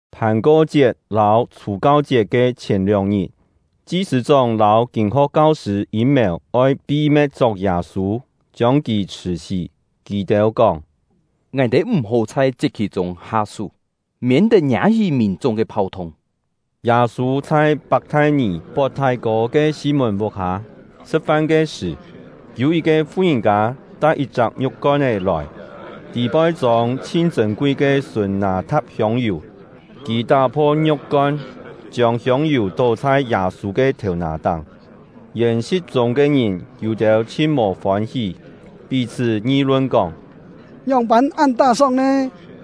Phàn-ko-chiet lâu Chhù-kau-chiet ke chhièn lióng-ngit, chi-sṳ̂-chóng lâu kîn-ho̍k kau-sṳ̂ yîm-mèu oi pi-me̍t chok Yâ-sû, chiông kì chhṳ̀-sí. Kì-têu kóng: “Ngài-têu m̀-hó chhai chiet-khì-chûng ha-sú, miên-tet ngiâ-hí mìn-chung ke phau-thung.” Yâ-sû chhai Pak-thai-nì pot thái-kô ke Sî-mùn vuk-hâ; sṳ̍t-fan ke sṳ̀, yû yit-ke fu-ngìn-kâ tai yit-chak ngiu̍k-kon-é lòi, tî-poi chông chhin chṳ̂n-kui ke sùn nâ-tha̍t hiông-yù. Kì tá-pho ngiu̍k-kon, chiông hiông-yù tó chhai Yâ-sû ke thèu-nà-táng. Yèn-si̍t chûng ke ngìn yû-têu chhin mò fôn-hí, pí-chhṳ́ ngi-lun kóng: “Ngióng-pân án tá-sóng nè?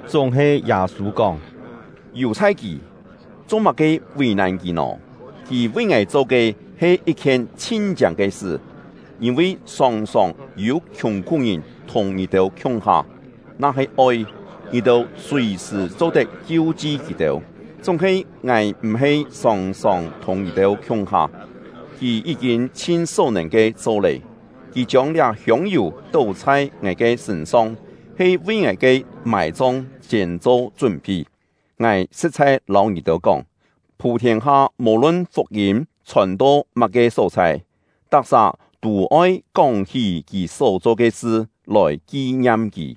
Chúng-he Yâ-sû kóng: “Yù-chhai kì! Cho-má-ke vì-nàn kì nò? Kì vi ngài cho ke he yit-khien chhin-chiâng ke sṳ. Yîn-vi sòng-sòng yû khiùng-khú-ngìn thùng ngì-têu khiung-ha, na-he oi, ngì-têu sùi-sṳ̀ cho-tet kiu-chi kì-têu; chúng-he ngài m̀-he sòng-sòng thùng ngì-têu khiung-ha. Kì yí-kîn chhin só-nèn ke cho lé; kì chiông liá hiông-yù tó chhai ngài ke sṳ̂n-song he vi ngài ke mài-chong siên cho chún-phi. Ngài sṳ̍t-chhai lâu ngì-têu kóng, phû-thiên-ha, mò-lun fuk-yîm chhòn-to má-ke só-chhai, tak-sà tû oi kóng-hí kì só-cho ke sṳ, lòi ki-ngiam kì.”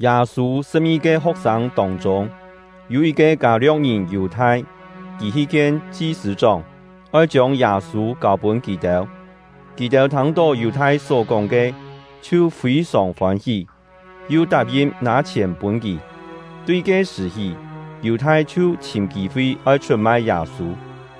Yâ-sû sṳ̍p-ngi-ke ho̍k-sâng tông-chûng, yû yit-ke Kâ-lio̍k-ngìn Yù-thai; kì hi kien chi-sṳ̂-chóng, oi chiông Yâ-sû kâu-pûn kì-têu. Kì-têu thâng-tó Yù-thai só-kóng ke, chhiu fî-sòng fôn-hí, yu tap-yin nâ chhièn pûn kì. Tui ke-sṳ̀ hí, Yù-thai chhiu chhìm kî-fi oi chhut-mai Yâ-sû.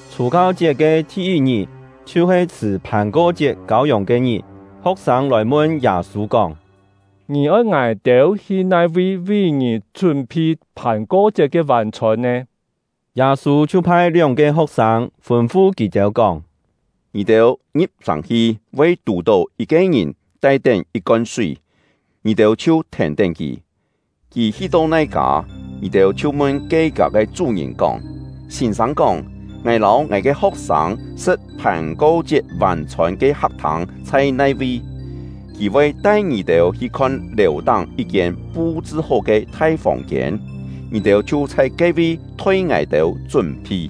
Chhù-kau-chiet ke thi-yit-ngit, chhiu-he chhṳ̀ Phàn-ko-chiet kâu-yòng ke-ngit, ho̍k-sâng lòi mun Yâ-sû kóng: “Ngì oi ngài-têu hi nai-vi vi ngì chún-phi Phàn-ko-chiet ke vân-chhôn nè?” Yâ-sû chhiu phai lióng-ke ho̍k-sâng, fûn-fu kì-têu kóng: “Ngì-têu ngi̍p-sàng hi, voi tù-tó yit-ke ngìn tai-tén yit-kon súi, ngì-têu chhiu thèn-tén kì; kì hi-to nai kâ, ngì-têu chhiu mun ke kâ ke chú-ngìn kóng: ‘Sîn-sâng kóng: Ngài lâu ngài ke ho̍k-sâng sṳ̍t Phàn-ko-chiet vân-chhôn ke hak-thâng chhai nai-vi?’ Kì voi tai ngì-têu hi khon lèu-táng yit-kiên pu-chṳ-hó ke thai fòng-kiên; ngì-têu chhiu chhai ke-vi thoi ngài-têu chún-phi.”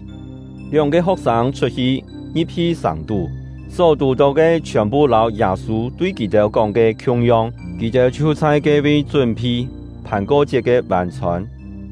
Lióng-ke ho̍k-sâng chhut-hi, ngi̍p-hi sàng-tú; só tù-tó ke chhiòn-phu lâu Yâ-sû tui kì-têu kóng ke khiung-yong; kì-têu chhiu chhai ke-vi chún-phi Phàn-ko-chiet ke vân-chhôn.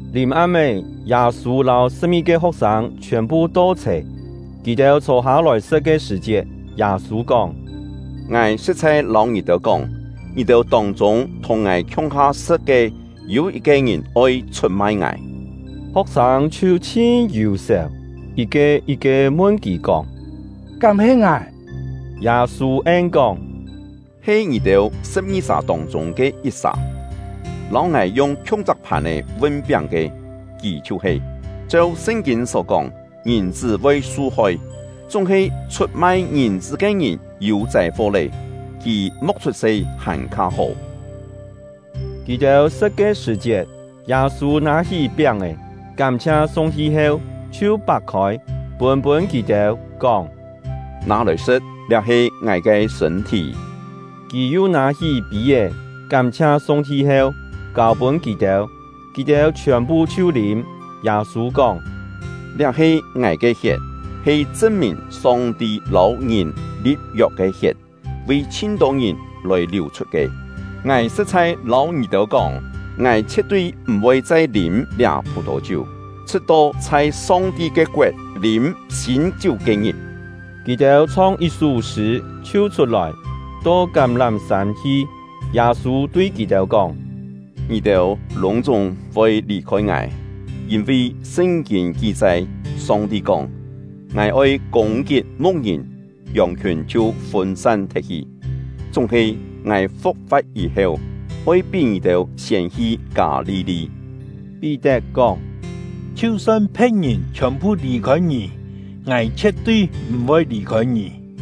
Lìm-am-é, Yâ-sû lâu sṳ̍p-ngi-ke ho̍k-sâng chhiòn-phu to-chhè. Kì-têu chhô-hâ-lòi sṳ̍t ke sṳ̀-chiet, Yâ-sû kóng: “Ngài sṳ̍t-chhai lâu ngì-têu kóng, ngì-têu tông-chûng thùng ngài khiung-ha sṳ̍t ke, yû yit-ke ngìn oi chhut-mai ngài.” Ho̍k-sâng chhiu chhin yù-sèu, yit-ke yit-ke mun kì kóng: “Kám he ngài?” Yâ-sû en-kóng: “He ngì-têu sṳ̍p-ngi-sà tông-chûng ke yit-sà; lâu ngài yung khiung-chak phàn-è vun-piáng ke, kì chhiu-he. Cheu Sṳn-kîn só kóng, Ngìn-chṳ́ voi su-hoi; chúng-he chhut-mai Ngìn-chṳ́ ke ngìn yû châi-fo lé! Kì mo̍k chhut-se hàn-kha hó!” Kì-têu sṳ̍t ke sṳ̀-chiet, Yâ-sû nâ-hí piáng-è, kám-chhia Song-ti heu, chhiu pak-khôi, pûn-pûn kì-têu, kóng: “Nâ-lòi sṳ̍t; liá he ngài ke sṳ̂n-thí.” Kì yu nâ-hí pî-é, kám-chhia Song-ti heu, kâu-pûn kì-têu; kì-têu chhiòn-phu chhiu lîm. Yâ-sû kóng: “Liá he ngài ke hiet, he chṳn-mìn Song-ti lâu ngìn li̍p-yok ke hiet, vi chhin-tô ngìn lòi liù-chhut ke. Ngài sṳ̍t-chhai lâu ngì-têu kóng, ngài chhie̍t-tui m̀-voi chai lîm liá phù-thò-chiú, chhṳ̍t-to chhai Song-ti ke koet lîm sîn-chiú ke-ngit.” Kì-têu chhong yit-sú sṳ̂, chhiu chhut-lòi, to Kám-lám-sân hi. Yâ-sû tui kì-têu kóng: “Ngì-têu lûng-chúng voi lì-khôi ngài, yîn-vi Sṳn-kîn ki-chai: Song-ti kóng: ‘Ngài oi kûng-kit mu̍k-ngìn, yòng-khiùn chhiu fûn-san thet-hi.’ Chúng-he ngài fu̍k-fa̍t yî-heu, oi pí ngì-têu siên hi Kâ-li-li.” Pí-tet kóng: “Chhiu-son phe̍t-ngìn chhiòn-phu lì-khôi ngì, ngài chhie̍t-tui m̀-voi lì-khôi ngì!”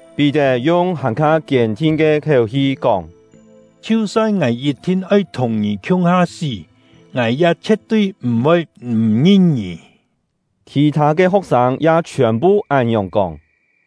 Pí-tet yung hàn-kha kiên-thin ke khiéu-hi kóng: “Chhiu-son ngài yit-thin oi thùng ngì khiung-ha sí, ngài ya chhie̍t-tui m̀-voi m̀ ngin ngì!” Khì-thâ ke ho̍k-sâng ya chhiòn-phu án-ngiòng kóng.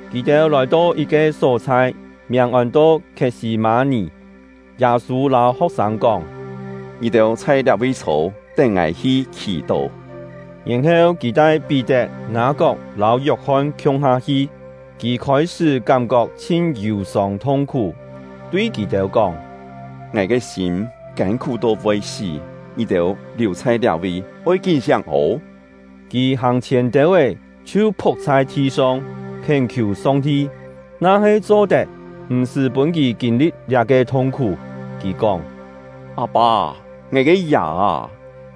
Kì-têu lòi-to yit-ke só-chhai, miàng ôn-to Khiet-sî-mâ-nì; Yâ-sû lâu ho̍k-sâng kóng: “Ngì-têu chhai liá-vi chhô, tén ngài hi khì-tó.” Yèn-heu kì tai Pí-tet, Ngâ-kok lâu Yok-hon khiung-ha hi. Kì khôi-sṳ́ kám-kok chhin yù-sông thung-khú, tui kì-têu kóng: “Ngài ke sîm kân-khú to voi sí. Ngì-têu liù chhai liá-vi, oi kín-siáng ô!” Kì hàng-chhièn têu-é, chhiu phu̍k chhai thi-song, khién-khiù Song-ti, na-he cho-tet, m̀-sṳ́ pûn kì kîn-li̍t liá-ke thung-khú. Kì kóng: “Â-pâ, ngài ke Yà â,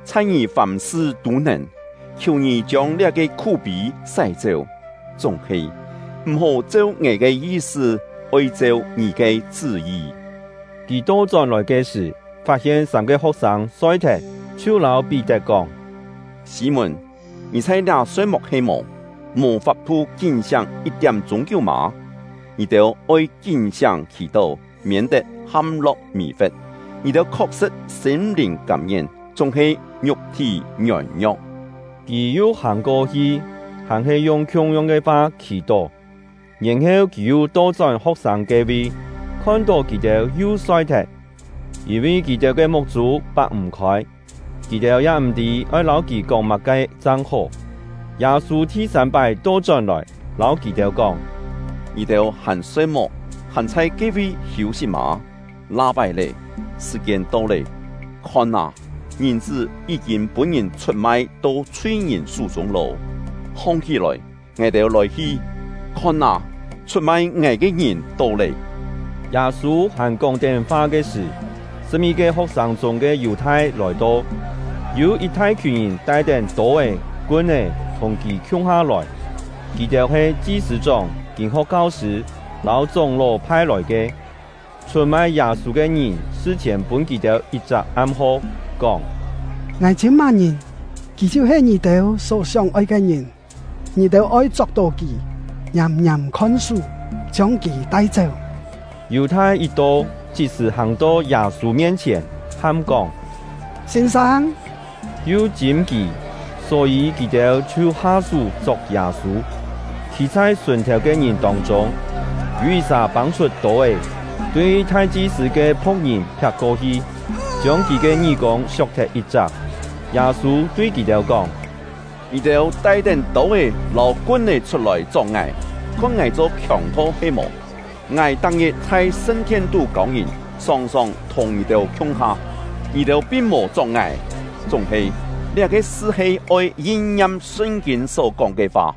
chhai Ngì fàm-sṳ tû nèn. Khiù Ngì chiông liá-ke khú-pî sái-chéu; chúng-he, m̀-hó cheu ngài ke yi-sṳ, oi cheu Ngì ke chṳ́-yi.” Kì to-chón-lòi ke sṳ̀, fat-hien sâm-ke ho̍k-sâng soi-thet, chhiu lâu Pí-tet kóng: “Sî-mùn, ngì chhai liá soi-muk he-mò? Mò fap-thu kín-siáng yit-tiám-chûng kiú mâ? Ngì-têu oi kín-siáng khì-tó, miên-tet ham-lo̍k mì-fe̍t. Ngì-têu khok-sṳ̍t sîm-lìn kâm-ngien, chúng-he ngiuk-thí ngiôn-ngio̍k.” Kì yu hàng-ko-hi, hàn-he yung khiung-yong ke fa khì-tó. Yèn-heu kì yu to-chón ho̍k-sâng ke-vi, khon-tó kì-têu yu soi-thet, yîn-vi kì-têu ke muk-chû pak-m̀-khôi; kì-têu ya m̀-tî oi lâu kì kóng má-ke chang hó. Yâ-sû thi-sâm-pái to-chón-lòi, lâu kì-têu kóng: “Ngì-têu hàn soi-muk, hàn chhai ke-vi hiû-sit mâ? La-pái lé, sṳ̀-kiên to lé, khon â, Ngìn-chṳ́ yí-kîn pûn-ngìn chhut-mai to chhui-ngìn sú-chûng lô. Hong-hí-lòi, ngài-têu lòi-hi! Khon â, chhut-mai ngài ke ngìn to lé!” Yâ-sû hàn kóng-tén fa ke sṳ̀, sṳ̍p-ngi-ke ho̍k-sâng chûng ke Yù-thai lòi-to. Yû yit thai-khiùn ngìn tai-tén tô-é, kun-é thùng kì khiung-ha lòi; kì-têu he chi-sṳ̂-chóng, kîn-ho̍k kau-sṳ̂, lâu chóng-ló phai-lòi ke. Chhut-mai Yâ-sû ke ngìn sṳ-chhièn pûn kì-têu yit-chak am-ho, kóng: “Ngài chîm má-ngìn, kì chhiu-he ngì-têu só sióng-oi ke ngìn. Ngì-têu oi chok-tó kì, ngiàm-ngiàm khon-sú, chiông kì tai-chéu.” Yù-thai yit to, chit-sṳ̀ hàng-to Yâ-sû mien-chhièn, ham kóng: “Sîn-sâng!” yu chîm kì. Só-yî kì-têu chhiu ha-sú chok Yâ-sû. Khî chhai sùn-thèu ke ngìn tông-chûng, yû yit-sà pâng-chhut tô-é, tui thai-chi-sṳ̂ ke phu̍k-ngìn phiak-ko-hi, chiông kì ke ngí-kûng siok-thet yit-chak. Yâ-sû tui kì-têu kóng: “Ngì-têu tai-tén tô-é lâu kun-é chhut-lòi chok ngài, khon ngài cho khiòng-tho he-mò? Ngài tak-ngit chhai sṳn-thien-tú kâu ngìn, sòng-sòng thùng ngì-têu khiung-ha, ngì-têu pin mò chok ngài. Chúng-he, liá-ke sṳ he oi yin-ngiam Sṳn-kîn só-kóng ke fa.”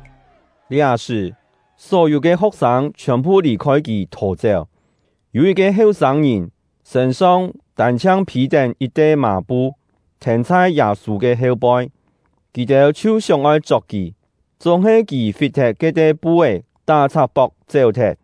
Liá-sṳ̀, só-yû ke ho̍k-sâng chhiòn-phu lì-khôi kì thò-chéu. Yû yit-ke heu-sâng-ngìn, sṳ̂n-song tân-chhiang phî-tén yit-te mà-pu, thèn chhai Yâ-sû ke heu-poi; kì-têu chhiu sióng-oi chok kì, chúng-he kì fit-thet ke-te pu-é, tá-chhak-pok chéu-thet.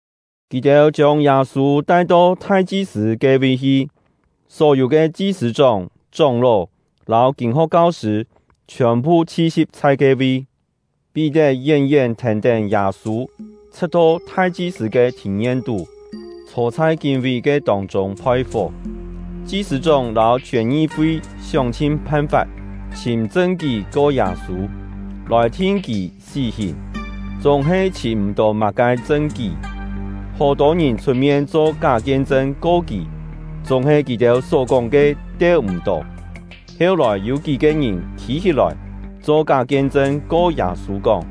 Kì-têu chiông Yâ-sû tai-to thai-chi-sṳ̂ ke-vi hi; só-yû ke chi-sṳ̂-chóng, chóng-ló, lâu kîn-ho̍k kau-sṳ̂ chhiòn-phu chhi-si̍p chhai ke-vi. Pí-tet yén-yén thèn-tén Yâ-sû, chhṳ̍t-to thai-chi-sṳ̂ ke thìn-yen-tú, chhô chhai kín-ví ke tông-chûng phoi-fó. Chi-sṳ̂-chóng lâu chhiòn ngi-fi sióng-chhin phan-fap chhìm chṳn-kí ko Yâ-sû, lòi thin kì sí-hìn, chúng-he chhìm m̀-tó má-ke chṳn-kí. Hó-tô ngìn chhut-mien cho ká kien-chṳn ko kì, chúng-he kì-têu só-kóng ke teu-m̀-tó. Heu-lòi yû kí-ke ngìn khî-hí-lòi, cho ká kien-chṳn ko Yâ-sû kóng: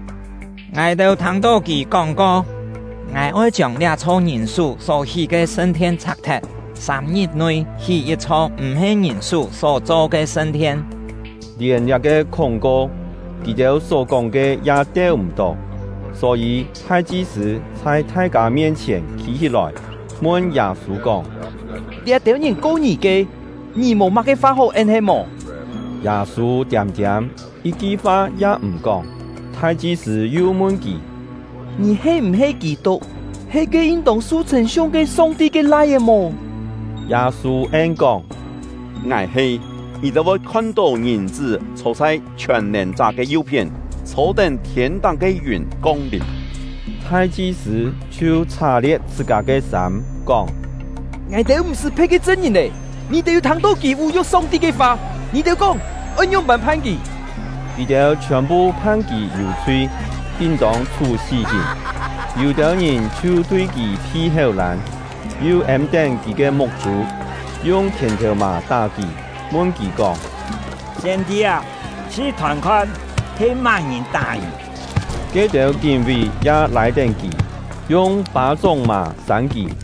“Ngài-têu thâng-tó kì kóng-ko: ‘Ngài oi chiông liá-chho ngìn-sú só hí ke sṳn-thien chhak-thet, sâm-ngit-nui hí yit-chho m̀-he ngìn-sú só-cho ke sṳn-thien.’” Lièn liá-ke khúng-ko, kì-têu só-kóng ke ya teu-m̀-tó. Só-yî thai-chi-sṳ̂ chhai thai-kâ mien-chhièn khî-hí-lòi, mun Yâ-sû kóng: “Liá-têu ngìn ko ngì ke, ngì mò má-ke fa hó en he-mò?” Yâ-sû tiâm-tiâm, yit-ki fa ya m̀ kóng. Thai-chi-sṳ̂ yu mun kì: “Ngì he m̀-he Kî-tuk, he ke yin-tông su chhṳ̂n-siung ke Song-ti ke Lai-é mò?” Yâ-sû en-kóng: “Ngài he! Ngì-têu voi khon-tó Ngìn-chṳ́ chhô chhai Chhiòn-nèn-chá ke yu-phién, chhô-tén thiên-táng ke yùn kong-lìm!” Thai-chi-sṳ̂ chhiu chhá-lie̍t chhṳ-kâ ke sâm, kóng: “Ngài-têu m̀-sṳ́ phe̍t ke chṳn-ngìn lé! Ngì-têu yû thâng-tó kì vú-yu̍k Song-ti ke fa. Ngì-têu kóng oi ngióng-pân phan kì?” Kì-têu chhiòn-phu phan kì yû-chhui, yin-tông chhú sí-hìn. Yû-têu ngìn chhiu tui kì phi héu-lân, yu êm-tén kì ke muk-chû, yung khièn-thèu-mà tá kì, mun kì kóng: “Siên-tî â, chhṳ-thòn-khon, he má-ngìn tá ngì?” Ke-têu kín-ví ya lâi-tén kì, yung pâ-chóng-mà sân kì.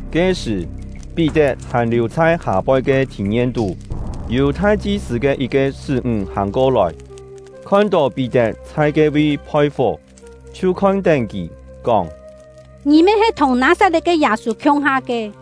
Ke-sṳ̀, Pí-tet hàn liù chhai hâ-poi ke thìn-yen-tú. Yû thai-chi-sṳ̂ ke yit-ke sṳ́-ńg hàng ko-lòi, khon-tó Pí-tet chhai ke-vi phoi-fó, chhiu khon-tén kì, kóng: “Ngì me he thùng Nâ-sat-le̍t ke Yâ-sû khiung-ha ke.”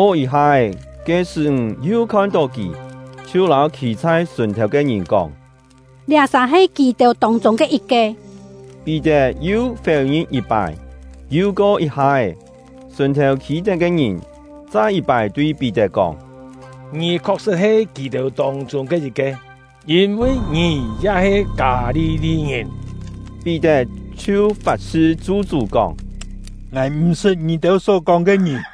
Ko yit-ha-é, ke sṳ́-ńg yu khon-tó kì, chhiu lâu khî chhai sùn-thèu ke ngìn kóng: “Liá-sà he kì-têu tông-chûng ke yit-ke!” Pí-tet yu féu-ngin yit-pái. Yu ko yit-ha-é, sùn-thèu khî-tén ke ngìn chai yit-pái tui Pí-tet kóng: “Ngì khok-sṳ̍t he kì-têu tông-chûng ke yit-ke, yîn-vi ngì ya he Kâ-li-li-ngìn!” Pí-tet chhiu fat-sṳ chu-chú kóng: “Ngài m̀-sṳt ngì-têu só-kóng ke ngìn!”